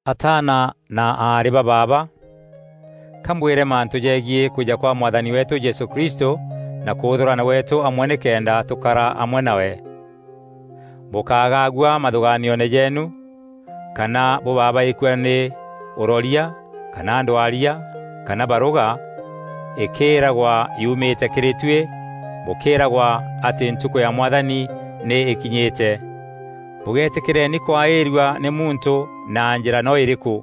Ataana na aarî ba baaba, ka mbwîre mantû jegiî kwîja kwa Mwathani weetû Jesû Kristû na kûûthûrana gweetû amwe nîkenda tûkara amwe nawe. Bûkágagua mathûgaanioone jeenu kana bûbabaîkua nî ûroria kana ndwaria kana barûga, îkîîragwa yumîte kîrî tuî bûkîîragwa atî ntukû ya Mwathani nî îkinyîte. Bûgéetîkîreni kwaîrua nî muntû na njîra no îrîkû,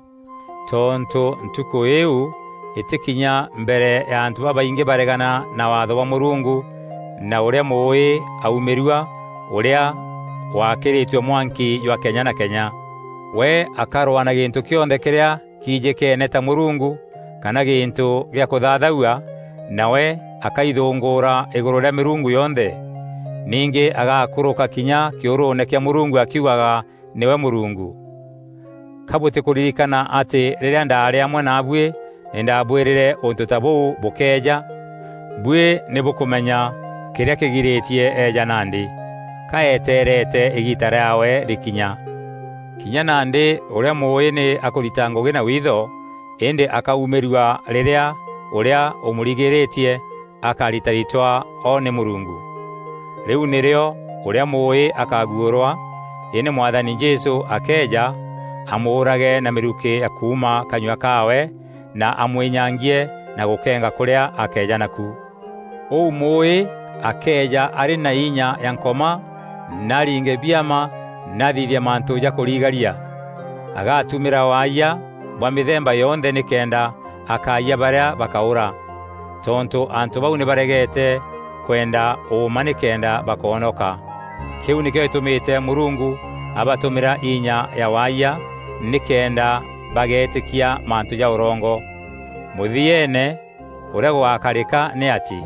tontû Ntukû îîu îtîkinya mbere ya antû babaingî baregana na Waatho bwa Mûrungu na ûrîa Mûûî aumîrua, ûrîa wakîrîtue mwanki jwa kenya na kenya. We akarwaa na gîntû kîonthe kîrîa kijîkeene ta mûrungu kana gîntû gîa kûthathaua, nawe akaithûngûûra îgûrû rîa mîrungu yonthe. Ningî agakûrûka kinya kîûrûûne kîa Mûrungu akiugaga nîwe Mûrungu. Ka bûtîkûririkana atî rîrîa ndaarî amwe naabuî nî ndaabwîrîre ûntû ta bûu bûkeeja? Buî nî bûkûmenya kîrîa kîgirîtie eeja nandî. Ka eteerete îgiita rîaawe rîkinya. Kinya nandî ûrîa Mûûî nî akûrita ngûgî na wiitho, îndî akaumîrua rîrîa ûrîa ûmûrigîrîtie akaritaritwa o nî Mûrungu. Rîu nîrîo ûrîa Mûûî akaguûrwa, îndî Mwathani Jesû akeeja, amûûrage na mîrukî ya kuuma kanyua kaawe na amwînyangie na gûkenga kûrîa akeeja naku. Ûu Mûûî akeeja arî na inya ya Nkoma na aringe biama na athithie mantû ja kûrigaria. Agatumîra waayia bwa mîthemba yonthe nîkenda akayia barîa bakaûra. Tontû antû bau nî baregete kwenda ûûma nîkenda bakoonoka. Kîu nîkîo gîtûmîte Mûrungu abatûmîra inya ya waayia nîkenda bageetîkia mantû ja ûrongo. Mûthieene ûrîa gûgakarîka nî atî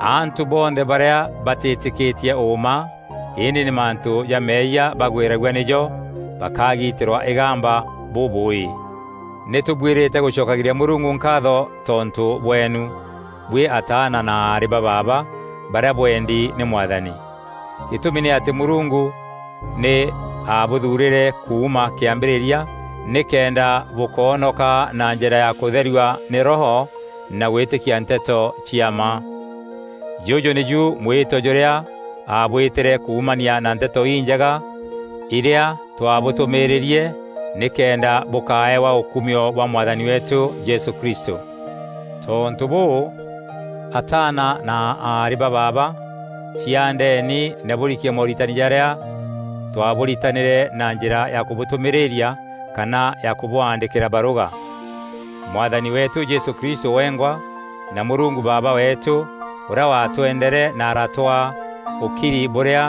antû bonthe barîa batîtîkîtie ûûma, îndî nî mantû ja meeyia bagwîragua nîjo, bakagitîrwa îgamba bûbûûî. Nî tûbuîrîte gûcokagîria Mûrungu nkaatho tontû bweenu, buî ataana na aarî ba baaba barîa bwendi nî Mwathani. Gîtûmi nî atî Mûrungu nî abûthuurîre kuuma kîambîrîria nîkenda bûkoonoka na njîra ya kûtherua nî Roho na gwîtîkia nteto cia mma. Jûjû nîju mwîto jûrîa aabwîtîre kuumania na Nteto Injega îrîa twaabûtûmîîrîrie nîkenda bûkaeewa ûkumio bwa Mwathani weetû Jesû Kristû. Tontû bûû, ataana na aarî ba baaba, ciaandeni na bûrikie mooritani jarîa twabûritanîre na njîra ya kûbûtûmîrîria kana ya kûbwaandîkîra barûga. Mwathani weetû Jesû Kristû wengwa na Mûrungu Baaba weetû, ûrîa watwendere na aratwaa ûkiri bûrîa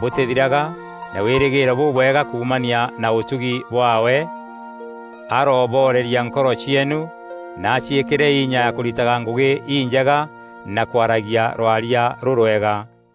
bûtîthiraga na wîrîgîîro bûbwega kuumania na ûtugi bwaawe, arooboreria nkoro cieenu na aciîkîre inya ya kûritaga ngûgî injega na kwaragia rwaria rûrwega.